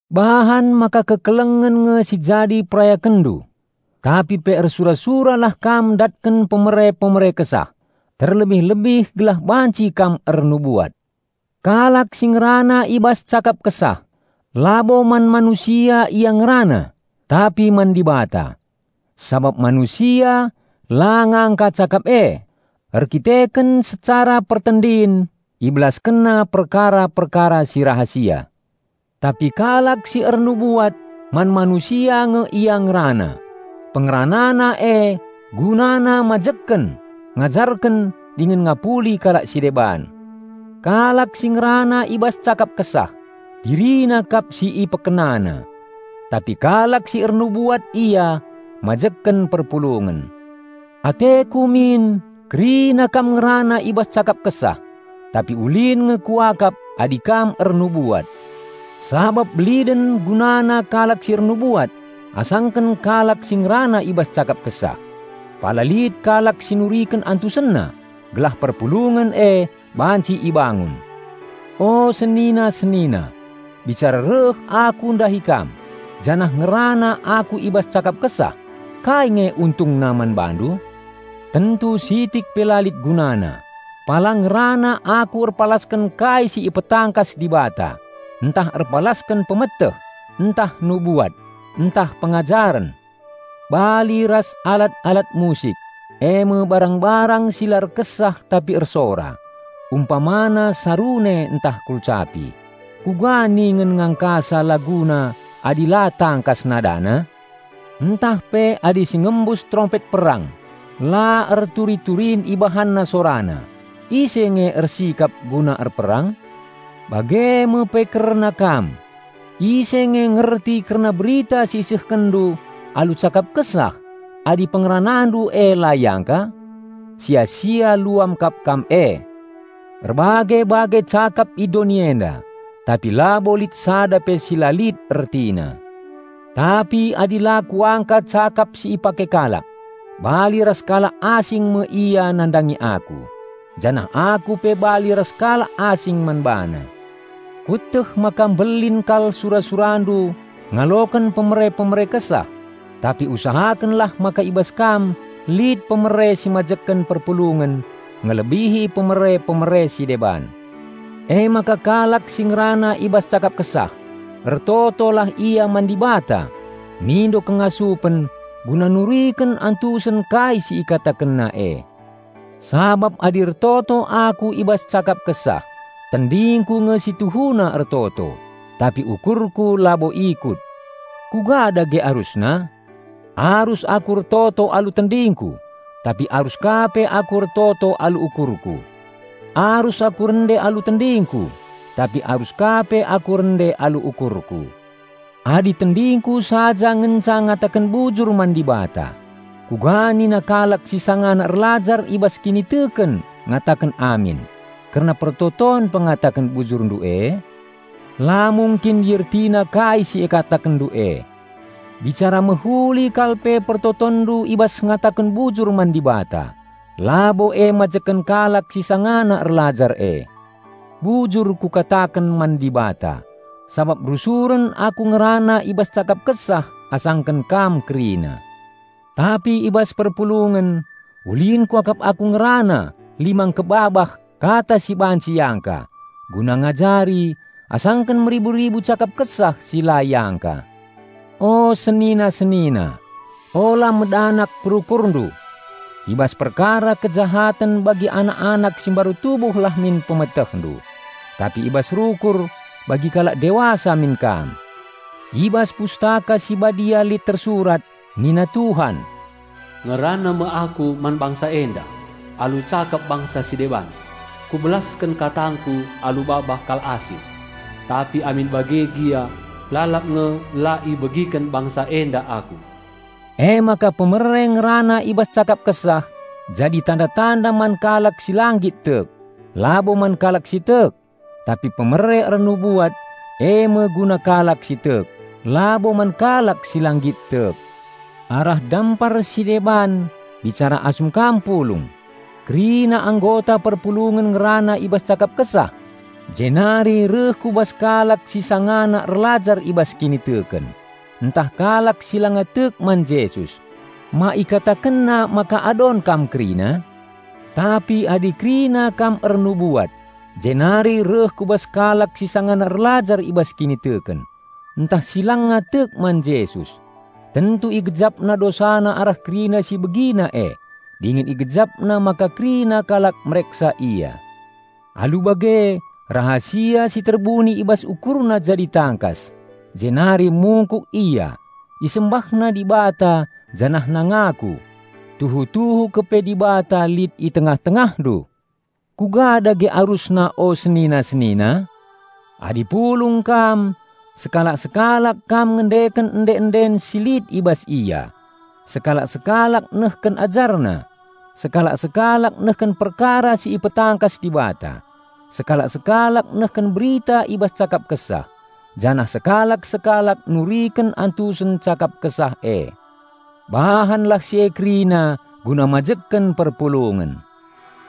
Bahan maka kekelengen nge si jadi perayakenndu, tapi pe ersura-suralah kam ndatken pemere-pemere Kesah, terlebih-lebih gelah banci kam ernubuat. Kalak si ngerana i bas cakap Kesah labo man manusia ia ngerana tapi man Dibata, sabap manusia la ngangka cakap e, erkiteken secara pertendin ibelaskenna perkara-perkara si rahasia. Tapi kalak si ernubuat man manusia nge ia ngerana; pengeranana e gunana mbangun, ngajarken dingen ngapuli kalak si deban. Kalak si ngerana i bas cakap Kesah, dirina kap si ipekenana. Tapi kalak si ernubuat ia mbangun perpulungen. Ateku min kerina kam ngerana i bas cakap Kesah; tapi ulin nge kuakap adi kam ernubuat. Sabap beliden gunana kalak si ernubuat asangken kalak si ngerana i bas cakap Kesah -- pala lit kalak si nuriken antusenna, gelah perpulungen e banci ibangun. O senina-senina, bicara reh aku ndahi kam, janah ngerana aku i bas cakap Kesah, kai nge untungna man bandu? Tentu sitik pe la lit gunana, pala ngerana aku erpalasken kai si ipetangkas Dibata, ntah erpalasken pemeteh, ntah nubuat, ntah pengajaren. Bali ras alat-alat musik, eme barang-barang si la erkesah tapi ersora, umpamana sarune ntah kulcapi, kuga ningen ngangkasa laguna adi la tangkas nadana? Ntah pe adi si ngembus terompet perang la erturi-turin ibahanna sorana, ise nge ersikap guna erperang? Bage me pe kerna kam; ise nge ngerti kerna berita si isehkenndu alu cakap Kesah adi pengeranandu e la iangka? Sia-sia luam kap kam e! Erbage-bage cakap i doni enda, tapi labo lit sada pe si la lit ertina. Tapi adi la kuangka cakap si ipake kalak, bali ras kalak asing me ia nandangi aku, janah aku pe bali ras kalak asing man bana. Kueteh maka mbelin kal sura-surandu ngaloken pemere-pemere Kesah, tapi usahakenlah maka i bas kam lit pemere si mbangun perpulungen ngelebihi pemere-pemere si deban. Emaka kalak si ngerana i bas cakap Kesah, ertotolah ia man Dibata mindo kengasupen guna nuriken antusen kai si ikatakenna e. Sabap adi ertoto aku i bas cakap Kesah, tendingku nge si tuhuna ertoto, tapi ukurku labo ikut. Kuga dage arusna? Arus aku ertoto alu tendingku, tapi arus ka pe aku ertoto alu ukurku. Arus aku rende alu tendingku, tapi arus ka pe aku rende alu ukurku. Adi tendingku saja ngenca ngataken bujur man Dibata, kuga nina kalak si sangana erlajar i bas kiniteken ngataken "Amin" kerna pertoton pengataken bujurndu e? La mungkin iertina kai si ikatakenndu e. Bicara mehuli kal pe pertotonndu i bas ngataken bujur man Dibata, labo e mbangun kalak si sangana erlajar e. Bujur kukataken man Dibata sabap rusuren aku ngerana i bas cakap Kesah asangken kam kerina. Tapi i bas perpulungen ulin kuakap aku ngerana lima engkebabah kata si banci iangka, guna ngajari, asangken meribu-ribu cakap Kesah si la iangka. O senina-senina, ula medanak perukurndu. I bas perkara kejahaten bagi anak-anak si mbaru tubuhlah min pemetehndu, tapi i bas rukur, bagi kalak dewasa min kam. I bas Pustaka Si Badia lit tersurat, nina Tuhan, "Ngerana me Aku man bangsa enda alu cakap bangsa si deban Kubelasken katangKu alu babah kalak asing, tapi amin bage gia, lalap nge la ibegiken bangsa enda Aku." Emaka pemere ngerana i bas cakap Kesah jadi tanda-tanda man kalak si la nggit tek, labo man kalak si tek, tapi pemere ernubuat, eme guna kalak si tek, labo man kalak si la nggit tek. Arah dampar si deban bicara asum kam pulung, kerina anggota perpulungen ngerana i bas cakap Kesah, jenari reh ku bas kalak si sangana erlajar i bas kiniteken, ntah kalak si langa tek man Jesus, ma ikatakenna maka adon kam kerina? Tapi adi kerina kam ernubuat jenari reh ku bas kalak si sangana erlajar i bas kiniteken, ntah si langa tek man Jesus, tentu igejapna dosana arah kerina si ibegina e, dingen igejapna maka kerina kalak mereksa ia. Alu bage rahasia si terbuni i bas ukurna jadi tangkas, jenari mungkuk ia, isembahna Dibata janahna ngaku, "Tuhu-tuhu kepe Dibata lit i tengah-tengahndu!" Kuga dage arusna o senina-senina? Adi pulung kam, sekalak-sekalak kam ngendeken ende-enden si lit i bas ia, sekalak-sekalak nehken ajarna, sekalak-sekalak nehken perkara si ipetangkas Dibata, sekalak-sekalak nehken berita i bas cakap Kesah, janah sekalak-sekalak nuriken antusen cakap Kesah e. Bahanlah si e kerina guna mbangun perpulungen.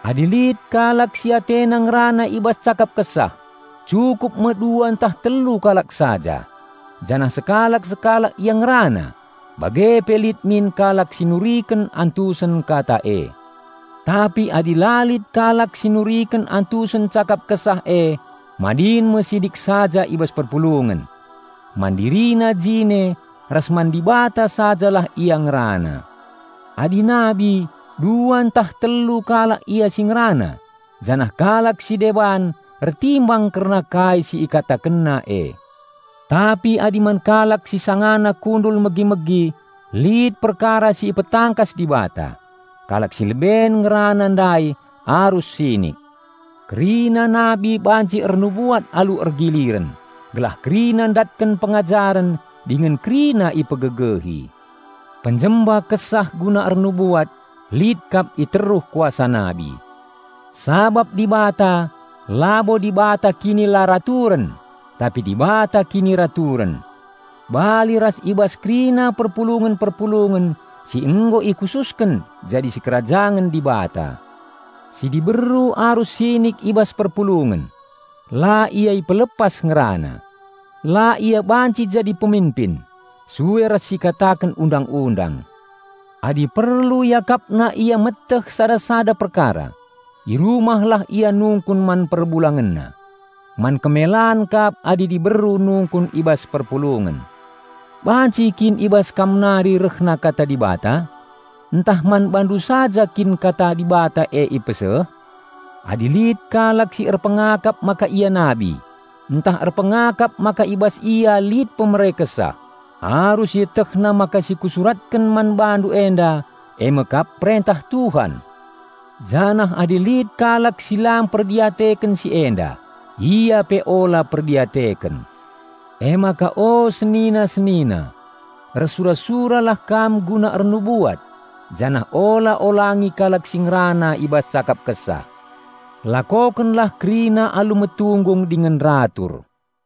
Adi lit kalak si atena ngerana i bas cakap Kesah, cukup me dua ntah telu kalak saja, janah sekalak-sekalak ia ngerana, bage pe lit min kalak si nuriken antusen kata e. Tapi adi la lit kalak si nuriken antusen cakap Kesah e, madin me sinik saja i bas perpulungen. Man dirina jine ras man Dibata saja lah ia ngerana. Adi nabi, dua ntah telu kalak ia si ngerana, janah kalak si deban ertimbang kerna kai si ikatakenna e. Tapi adi man kalak si sangana kundul megi-megi lit perkara si ipetangkas Dibata, kalak si leben ngerana ndai arus sinik. Kerina nabi banci ernubuat alu ergiliren, gelah kerina ndatken pengajaren dingen kerina ipegegehi. Penjemba Kesah guna ernubuat lit kap i teruh kuasa nabi. Sabap Dibata labo Dibata kinilaraturen, tapi Dibata kiniraturen. Bali ras i bas kerina perpulungen-perpulungen si nggo ikhususken jadi sikerajangen Dibata. Si diberu arus sinik i bas perpulungen. La ia ipelepas ngerana. La ia banci jadi peminpin, sue ras si ikataken Undang-undang. Adi perlu iakapna ia meteh sada-sada perkara, i rumah lah ia nungkun man perbulangenna. Man kemelan kap adi diberu nungkun i bas perpulungen. Banci kin i bas kam nari rehna Kata Dibata? Ntah man bandu saja kin Kata Dibata e ipeseh? Adi lit kalak si erpengakap maka ia nabi, ntah erpengakap maka i bas ia lit pemere Kesah, arus ietehna maka si kusuratken man bandu enda eme kap perentah Tuhan. Janah adi lit kalak si la mperdiateken si enda, ia pe ula perdiateken. Emaka o senina-senina, ersura-suralah kam guna ernubuat, janah ula olangi kalak si ngerana i bas cakap Kesah. Lakokenlah kerina alu metunggung dingen ratur.